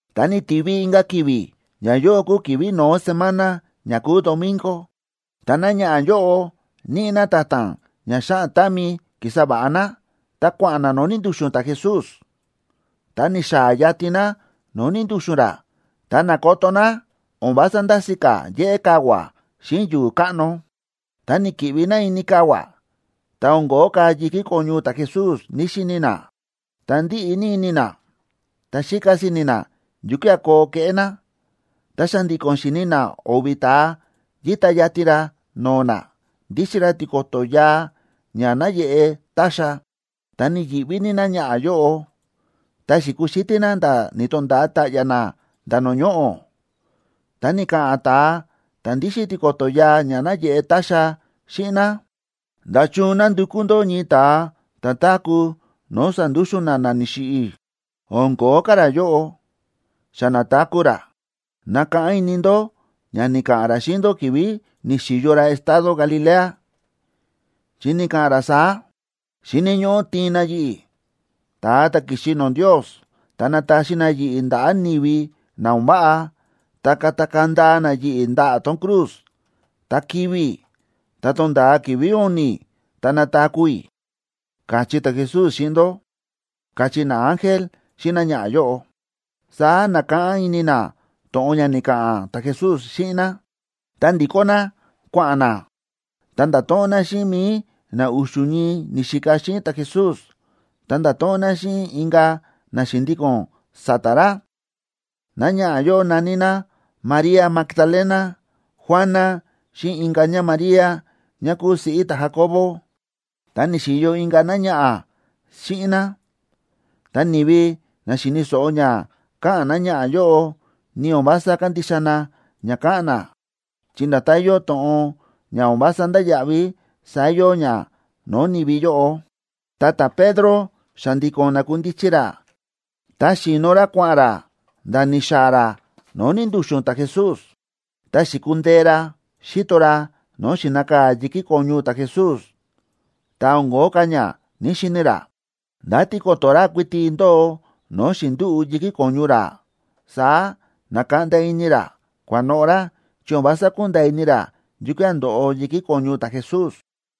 Ta ni̱tivi inka̱ ki̱vi̱; ñayóꞌo kúu ki̱vi̱ no̱ó semana ña kúu domingo, ta náñaꞌa̱ yóꞌo níꞌi ná ta̱ta̱n ña xáꞌan támi ki̱sa va̱ꞌa ná, ta kua̱ꞌa̱n ná no̱o̱ ni̱ndu̱xu̱n ta̱Jesús. Ta ni̱xaa̱ yatin ná no̱o̱ ni̱ndu̱xu̱n ra, ta na̱koto ná o̱n vása ndási̱ ka̱ yéꞌé kavua̱ xíꞌin yu̱u̱ káꞌno. Ta ni̱ki̱ꞌvi ná ini kavua̱, ta o̱n ko̱ó ka̱ yi̱kí ko̱ñu ta̱Jesús ní‑xini ná. Ta ndíꞌi ní ini ná, ta xíka si̱ni̱ ná yukía̱ koo keꞌé ná. Ta xa̱ndi̱ko̱n xi̱ni ná o̱vi̱ ta̱a yíta yatin ra no̱o̱ ná, ndíxin ra tiko̱to̱ yaa ña náyeꞌe táxa. Ta ni̱yi̱ꞌví ní náñaꞌa̱ yóꞌo, ta xi̱kuxítí ná nda̱ ni̱to̱nda̱a ta̱ꞌya̱ ná nda̱ no̱o̱ ñoꞌo̱. Ta ni̱ka̱ꞌa̱n ta̱a ta̱ ndíxin tiko̱to̱ yaa ña náyeꞌe táxa xíꞌin ná: ―¿Nda̱chun nándukú ndó ñii ta̱ táku̱ no̱o̱ sándúxu̱n na na ni̱xiꞌi̱? O̱n ko̱ó ka̱ ra yóꞌo. ¡Xa na̱taku̱ ra! Nakáꞌán ini ndó ña ni̱ka̱ꞌa̱n ra xíꞌin ndó ki̱vi̱ ni̱xi̱yo ra estado Galilea, chi ni̱ka̱ꞌa̱n ra saá: “Xíni̱ ñóꞌó tiin na yi̱ꞌi̱, ta̱a ta̱ ki̱xi no̱o̱ Ndios, ta nataxi na yi̱ꞌi̱ ndaꞌa̱ ni̱vi na o̱n váꞌa, ta katakaa̱ ndaa na yi̱ꞌi̱ ndaꞌa̱ tón cruz, ta kivi̱ i̱. Tá tonda̱a ki̱vi̱ u̱ni̱, ta nataku̱ i̱”, káchí ta̱Jesús xíꞌin ndó ―káchí naángel xíꞌin náñaꞌa̱ yóꞌo. Saá na̱káꞌán ini ná to̱ꞌon ni̱ka̱ꞌa̱n ta̱Jesús xíꞌin ná, ta ndi̱kó ná kua̱ꞌa̱n ná, ta nda̱to̱ꞌon ná xíꞌin mi̱i na u̱xu̱ ñii ni̱xika xíꞌin ta̱Jesús, ta nda̱to̱ꞌon ná xíꞌin inka̱ na xi̱ndíko̱n sa̱ta̱ ra. Náñaꞌa̱ yóꞌo na̱ní ná: María Magdalena, Juana, xíꞌin inka̱ ñáMaría, ñá kúu siꞌí ta̱Jacobo. Ta ni̱xi̱yo inka̱ ka̱ náñaꞌa̱ xíꞌin ná. Ta ni̱vi na xi̱ni̱ so̱ꞌo ña káꞌa̱n náñaꞌa̱ yóꞌo, ni o̱n vása kándixa na ña káꞌa̱n ná, chi nda̱tán yóo to̱ꞌon ña o̱n vása ndáya̱ꞌví, saá yóo ña no̱o̱ ni̱vi yóꞌo. Ta ta̱Pedro xa̱ndi̱ko̱n na̱kundichi ra, ta xi̱no ra kua̱ꞌa̱n ra nda̱ ni̱xaa̱ ra no̱o̱ ni̱ndu̱xu̱n ta̱Jesús. Ta xi̱kundee ra, xi̱to ra no̱o̱ xi̱nakaa̱ yi̱kí ko̱ñu ta̱Jesús, ta o̱n ko̱ó ka̱ ña ní‑xini ra. Nda̱ tiko̱to̱ ra kuiti ndóo no̱o̱ xi̱ndúꞌu̱ yi̱kí ko̱ñu ra. Saá na̱kaꞌnda ini ra, kua̱noꞌo̱ ra, chi o̱n vása ku̱nda̱a̱ ini ra yukía̱ ndo̱ꞌo yi̱kí ko̱ñu ta̱Jesús.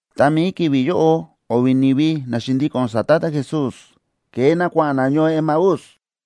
Ta mi̱i ki̱vi̱ yóꞌo o̱vi̱ ni̱vi na xi̱ndíko̱n sa̱ta̱ ta̱Jesús, ke̱e na kua̱ꞌa̱n na ñoo Emaús.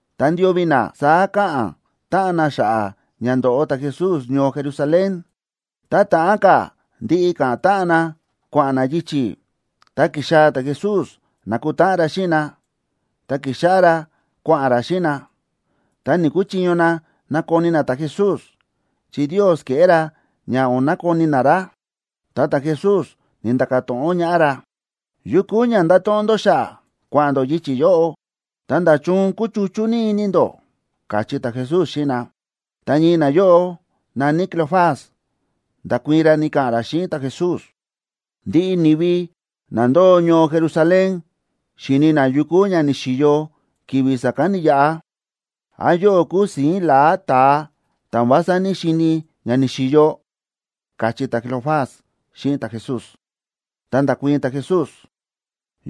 Ta ndio̱vi̱ na saá káꞌa̱n táꞌan na xa̱ꞌa̱ ña ndo̱ꞌo ta̱Jesús ñoo Jerusalén. Tá ta̱ꞌán ka̱ ndiꞌi ka̱ꞌa̱n táꞌan na kua̱ꞌa̱n na yichi̱, ta ki̱xaa̱ ta̱Jesús na̱kutáꞌan ra xíꞌin na, ta ki̱xáꞌá ra kua̱ꞌa̱n ra xíꞌin na. Ta ni̱‑kuchiño na nakoni na ta̱Jesús, chi Ndios ke̱ꞌé ra ña o̱n nakoni na ra. Ta ta̱Jesús ni̱nda̱ka̱ to̱ꞌon ñaꞌá ra: ―¿Yu kúu ña ndáto̱ꞌon ndó xa̱ꞌa̱, kua̱ꞌa̱n ndó yichi̱ yóꞌo? Ta, ¿nda̱chun kúchuchú ní ini ndó? ―káchí ta̱Jesús xíꞌin na. Ta ñii nayóꞌo na̱ní Cleofas, nda̱kuii̱n ra, ni̱ka̱ꞌa̱n ra xíꞌin ta̱Jesús: ―Ndiꞌi ni̱vi na ndóo ñoo Jerusalén xíni̱ na yu kúu ña ni̱xi̱yo ki̱vi̱ sa̱kán ni̱yaꞌa. ¿Án yóꞌó kúu si̱ín la̱á ta̱a, ta̱ o̱n vása ní‑xini̱ ña ni̱xi̱yo? ―káchí ta̱Cleofas xíꞌin ta̱Jesús. Ta nda̱kuii̱n ta̱Jesús: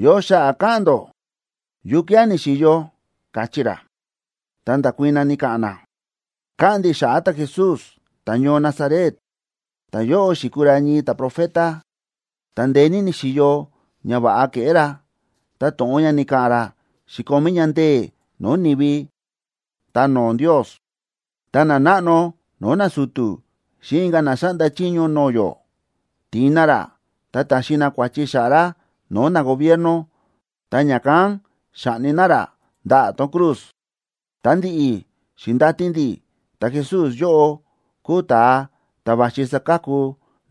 ―¿Yo xa̱ꞌa̱ káꞌa̱n ndó? ¿Yukía̱ ni̱xi̱yo? ―káchí ra. Ta nda̱kuii̱n na, ni̱ka̱ꞌa̱n na: ―Káꞌa̱n ndi̱ xa̱ꞌa̱ ta̱Jesús ta̱ñoo Nazaret. Ta̱yóꞌo xi̱kuu ra ñii ta̱profeta, ta ndeé ní ni̱xi̱yo ñava̱ꞌa ke̱ꞌé ra, ta to̱ꞌon ña ni̱ka̱ꞌa̱n ra xi̱komí ña ndee̱ no̱o̱ ni̱vi ta no̱o̱ Ndios. Ta nanáꞌno no̱o̱ nasu̱tu̱ xíꞌin inka̱ na xáꞌnda chiño no̱o̱ yó, ti̱in na ra, ta ta̱xi na kua̱chi xa̱ꞌa̱ ra no̱o̱ nagobierno, ta ña̱kán xa̱ꞌni na ra ndaꞌa̱ tón cruz. Ta ndi̱ꞌi̱, xi̱ndati ndi̱ ta̱Jesús yóꞌo kúu ta̱a ta̱ va̱xi saka̱ku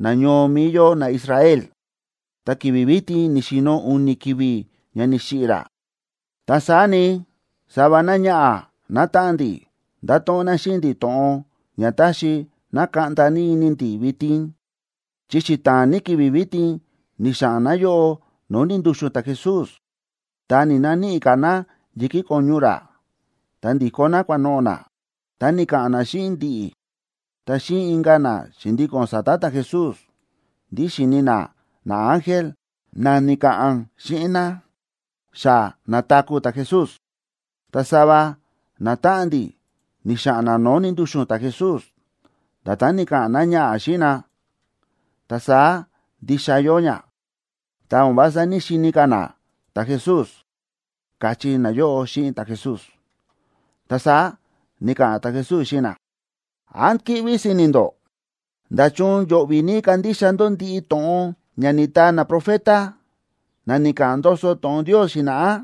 nañoo mi̱i yó naIsrael. Ta ki̱vi̱ vitin ni̱xi̱no̱ u̱ni̱ ki̱vi̱ ña ni̱xiꞌi̱ ra. Ta saá ni, sava náñaꞌa̱ nátáꞌan ndi̱ nda̱to̱ꞌon ná xíꞌin ndi̱ to̱ꞌon ña ta̱xi na̱kaꞌnda ní ini ndi̱ vitin, chi xita̱a̱n ní ki̱vi̱ vitin ni̱xa̱ꞌa̱n náyóꞌo no̱o̱ ni̱ndu̱xu̱n ta̱Jesús, ta ni̱‑naníꞌi ka̱ ná yi̱kí ko̱ñu ra. Ta ndi̱kó ná kua̱noꞌo̱ ná, ta ni̱ka̱ꞌa̱n ná xíꞌin ndi̱ꞌi̱, ta xíꞌin inka̱ na xi̱ndíko̱n sa̱ta̱ ta̱Jesús ndí xi̱ni ná naángel na ni̱ka̱ꞌa̱n xíꞌin ná xa na̱taku̱ ta̱Jesús. Ta sava natáꞌan ndi̱ ni̱xa̱ꞌa̱n na no̱o̱ ni̱ndu̱xu̱n ta̱Jesús. Nda̱tán ni̱ka̱ꞌa̱n náñaꞌa̱ xíꞌin na, ta saá ndixa yóo ña, ta o̱n vása ní‑xini ka̱ na ta̱Jesús ―káchí nayóꞌo xíꞌin ta̱Jesús. Ta saá ni̱ka̱ꞌa̱n ta̱Jesús xíꞌin na: ―¿Án kíꞌví si̱ni̱ ndó? ¡Nda̱chun yo̱ꞌvi̱ ní kandixa ndó ndiꞌi to̱ꞌon ña ni̱taa naprofeta, na ni̱ka̱ꞌa̱n ndoso to̱ꞌon Ndios xi̱na̱ꞌá!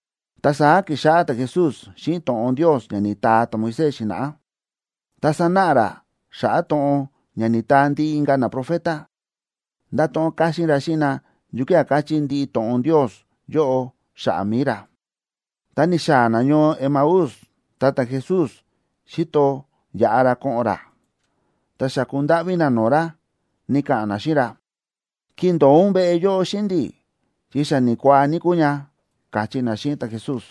Ta saá ki̱xáꞌá ta̱Jesús xíꞌin to̱ꞌon Ndios ña ni̱taa ta̱Moisés xi̱na̱ꞌá, ta sa̱náꞌa ra xa̱ꞌa̱ to̱ꞌon ña ni̱taa ndiꞌi inka̱ naprofeta. Nda̱to̱ꞌon káxín ra xíꞌin na yukía̱ káchí ndiꞌi to̱ꞌon Ndios yóꞌo xa̱ꞌa̱ mi̱i ra. Ta ni̱xaa̱ na ñoo Emaús, ta ta̱Jesús xi̱to yaꞌa ra ko̱ꞌo̱n ra. Ta xa̱ku ndáꞌví na no̱o̱ ra, ni̱ka̱ꞌa̱n na xíꞌin ra: ―Kindo̱o ún veꞌe yóꞌo xíꞌin ndi̱, chi xa ni̱kuaa ní kúu ña ―káchí na xíꞌin ta̱Jesús.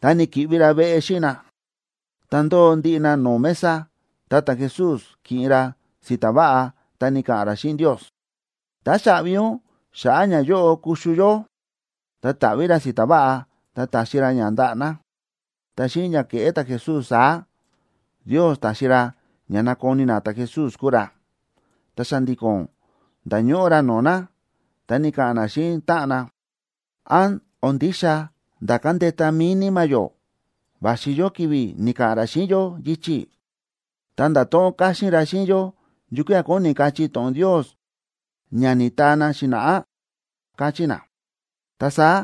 Ta ni̱ki̱ꞌvi ra veꞌe xíꞌin na. Ta ndóo ndiꞌi na no̱o̱ mesa, ta ta̱Jesús ki̱ꞌin ra si̱ta̱ váꞌa, ta ni̱ka̱ꞌa̱n ra xíꞌin Ndios: ―Táxaꞌvi ún xa̱ꞌa̱ ñayóꞌo kuxu yó. Ta ta̱ꞌví ra si̱ta̱ váꞌa, ta ta̱xi ra ña ndaꞌa̱ na. Ta xíꞌin ña ke̱ꞌé ta̱Jesús saá, Ndios ta̱xi ra ña na̱koni na ta̱Jesús kúu ra. Ta xa̱ndi̱ko̱n nda̱ñóꞌó ra no̱o̱ na. Ta ni̱ka̱ꞌa̱n na xíꞌin táꞌan na: ―¿Án o̱n ndixa nda̱ ka̱ndeta mi̱i níma̱ yó va̱xi yó ki̱vi̱ ni̱ka̱ꞌa̱n ra xíꞌin yó yichi̱, ta nda̱to̱ꞌon káxín ra xíꞌin yó yukía̱ kóni kachí to̱ꞌon Ndios ña ni̱taa na xi̱na̱ꞌá? ―káchí na. Ta saá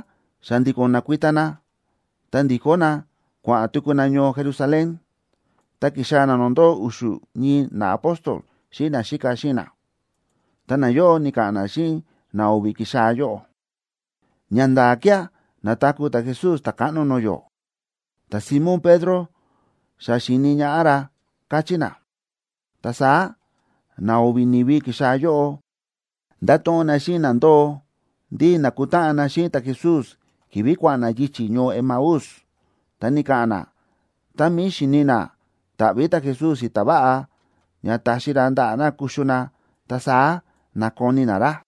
xa̱ndi̱ko̱n na̱kuita na, ta ndi̱kó na kua̱ꞌa̱n tuku na ñoo Jerusalén. Ta ki̱xaa̱ na no̱o̱ ndóo u̱xu̱ ñii naapóstol xíꞌin naxíka xíꞌin na. Ta nayóꞌo ni̱ka̱ꞌa̱n na xíꞌin na o̱vi̱ ki̱xaa̱ yóꞌo: ―¡Ñanda̱a̱ kía̱ na̱taku̱ ta̱Jesús Ta̱káꞌno no̱o̱ yó! Ta̱Simón Pedro xa xi̱ni̱ ñaꞌá ra ―káchí na. Ta saá na o̱vi̱ ni̱vi ki̱xaa̱ yóꞌo, nda̱to̱ꞌon na xíꞌin na ndóo ndí na̱kutáꞌan na xíꞌin ta̱Jesús ki̱vi̱ kua̱ꞌa̱n na yichi̱ ñoo Emaús. Ta ni̱ka̱ꞌa̱n na tá mi̱i xíni na táꞌví ta̱Jesús si̱ta̱ váꞌa ña taxi ra ndaꞌa̱ na kuxu na, ta saá na̱koni na ra.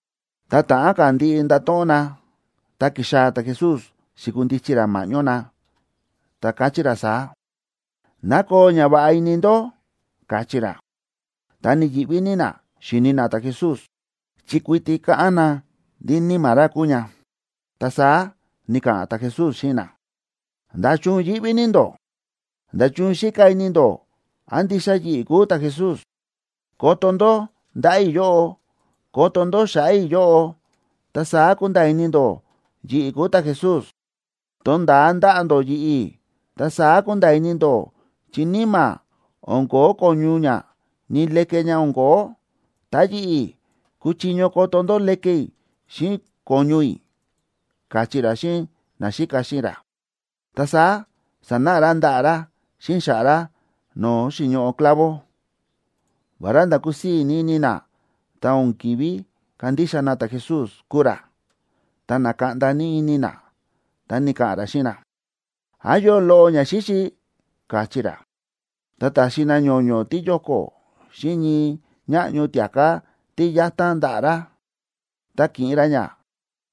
Ta ta̱ꞌán ka̱ ndiꞌi ndato̱ꞌon na, ta ki̱xaa̱ ta̱Jesús xi̱kundichi ra ma̱ꞌñó na, ta káchí ra saá: ―¡Ná koo ñava̱ꞌa ini ndó! ―káchí ra. Ta ni̱yi̱ꞌví ní na xíni na ta̱Jesús, chi kuiti káꞌán na ndí níma̱ ra kúu ña. Ta saá ni̱ka̱ꞌa̱n ta̱Jesús xíꞌin na: ―¿Nda̱chun yíꞌví ní ndó? ¿Nda̱chun xíka ini ndó án ndixa yi̱ꞌi̱ kúu ta̱Jesús? Koto ndó ndaꞌa̱ i̱ yóꞌo, koto ndó xa̱ꞌa̱ i̱ yóꞌo, ta saá kunda̱a̱ ini ndó yi̱ꞌi̱ kúu ta̱Jesús. Tonda̱a ndaꞌa̱ ndó yi̱ꞌi̱, ta saá kunda̱a̱ ini ndó, chi níma̱ o̱n ko̱ó ko̱ñu ña, ni leke ña o̱n ko̱ó; ta yi̱ꞌi̱, kúchiño koto ndó leke i̱ xíꞌin ko̱ñu i̱ ―káchí ra xíꞌin naxíka xíꞌin ra. Ta saá sa̱náꞌa ra ndaꞌa̱ ra xíꞌin xa̱ꞌa̱ ra no̱o̱ xi̱ñoꞌo clavo. Vará nda̱ kúsii̱ ní ini na, ta o̱n ki̱ví kandixa na ta̱Jesús kúu ra, ta na̱kaꞌnda ní ini na. Ta ni̱ka̱ꞌa̱n ra xíꞌin na: ―¿Án yóo loꞌo ñaxíxi? ―káchí ra. Ta ta̱xi na ño̱ño̱ tíyóko̱ xíꞌin ñii ñáꞌño tia̱ká tí yatan ndaꞌa̱ ra. Ta ki̱ꞌin ra ña,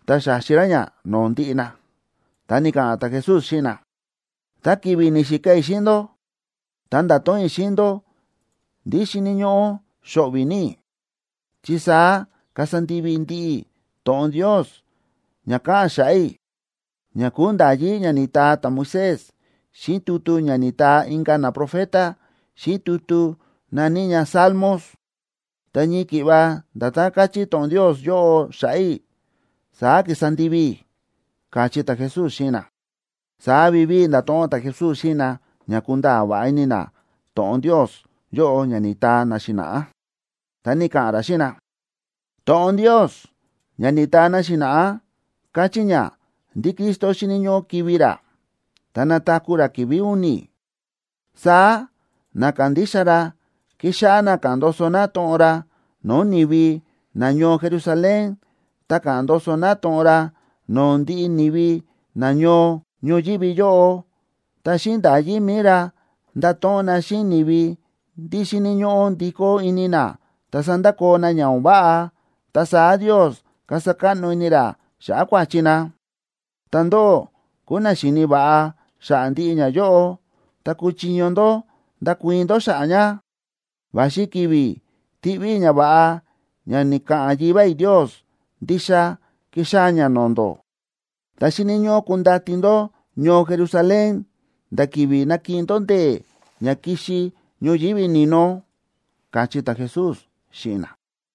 ta xa̱xi ra ña no̱o̱ ndiꞌi na. Ta ni̱ka̱ꞌa̱n ta̱Jesús xíꞌin na: ―Ta ki̱vi̱ ni̱xika i̱ xíꞌin ndó, ta nda̱to̱ꞌon i̱ xíꞌin ndó ndí xíni̱ ñóꞌó xo̱ꞌvi̱ ní i̱, chi saá kasa ndivi i̱ ndiꞌi to̱ꞌon Ndios ña káꞌa̱n xa̱ꞌa̱ i̱, ña kúu nda̱yí ña ni̱taa ta̱Moisés xíꞌin tutu ña ni̱taa inka̱ naprofeta, xíꞌin tutu na̱ní ña Salmos. Ta ñii ki̱ꞌva nda̱tán káchí to̱ꞌon Ndios yóꞌo xa̱ꞌa̱ i̱, saá ki̱sa ndivi i̱ ―káchí ta̱Jesús xíꞌin na. Saá vivíi nda̱to̱ꞌon ta̱Jesús xíꞌin na ña kunda̱a̱ va̱ꞌa ini na to̱ꞌon Ndios yóꞌo ña ni̱taa na xi̱na̱ꞌá. Ta ni̱ka̱ꞌa̱n ra xíꞌin na: ―To̱ꞌon Ndios ña ni̱taa na xi̱na̱ꞌá káchí ña ndí Cristo xíni̱ ñóꞌó kivi̱ ra, ta nataku̱ ra ki̱vi̱ u̱ni̱. Saá na kándixa ra kixáꞌá na ka̱ꞌa̱n ndoso na to̱ꞌon ra no̱o̱ ni̱vi nañoo Jerusalén, ta ka̱ꞌa̱n ndoso na to̱ꞌon ra no̱o̱ ndiꞌi ni̱vi nañoo ñoyívi yóꞌo. Ta xíꞌin nda̱yí mi̱i ra, ndato̱ꞌon na xíꞌin ni̱vi ndí xíni̱ ñóꞌó ndikó ini na ta sandakoo na ña o̱n váꞌa, ta saá Ndios kasa káꞌno ini ra xa̱ꞌa̱ kua̱chi na. Ta ndóꞌó kúu na xíni̱ va̱ꞌa xa̱ꞌa̱ ndiꞌi ñayóꞌo, ta kúchiño ndó ndakuii̱n ndó xa̱ꞌa̱ ña. Va̱xi ki̱vi̱ tiꞌví i̱ ñava̱ꞌa ña ni̱ka̱ꞌa̱n Yivá i̱ Ndios ndixa kixaa̱ ña no̱o̱ ndó. Ta xíni̱ ñóꞌó kundati ndó ñoo Jerusalén nda̱ ki̱vi̱ nakiꞌin ndó ndee̱ ña kixi ñoyívi ni̱no ―káchí ta̱Jesús xíꞌin na.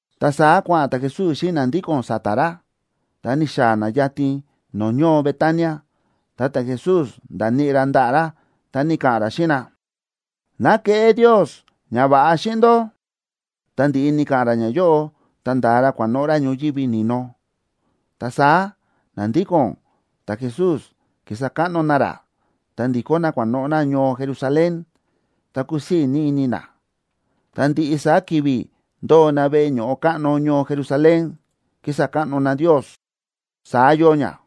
Ta saá kua̱ꞌa̱n ta̱Jesús xíꞌin na ndíko̱n sa̱ta̱ ra, ta ni̱xaa̱ na yatin no̱o̱ ñoo Betania. Ta ta̱Jesús nda̱níꞌi ra ndaꞌa̱ ra, ta ni̱ka̱ꞌa̱n ra xíꞌin na: ―¡Ná keꞌé Ndios ñava̱ꞌa xíꞌin ndó! Ta ndi̱ꞌi ni̱ka̱ꞌa̱n ra ñayóꞌo, ta nda̱a ra kua̱noꞌo̱ ra ñoyívi ni̱no. Ta saá na ndíko̱n ta̱Jesús ki̱sa káꞌno na ra, ta ndi̱kó na kua̱noꞌo̱ na ñoo Jerusalén, ta kúsii̱ ní ini na. Ta ndiꞌi saá ki̱vi̱ ndóo na veꞌe ño̱ꞌo káꞌno ñoo Jerusalén, kísa káꞌno na Ndios. Saá yóo ña.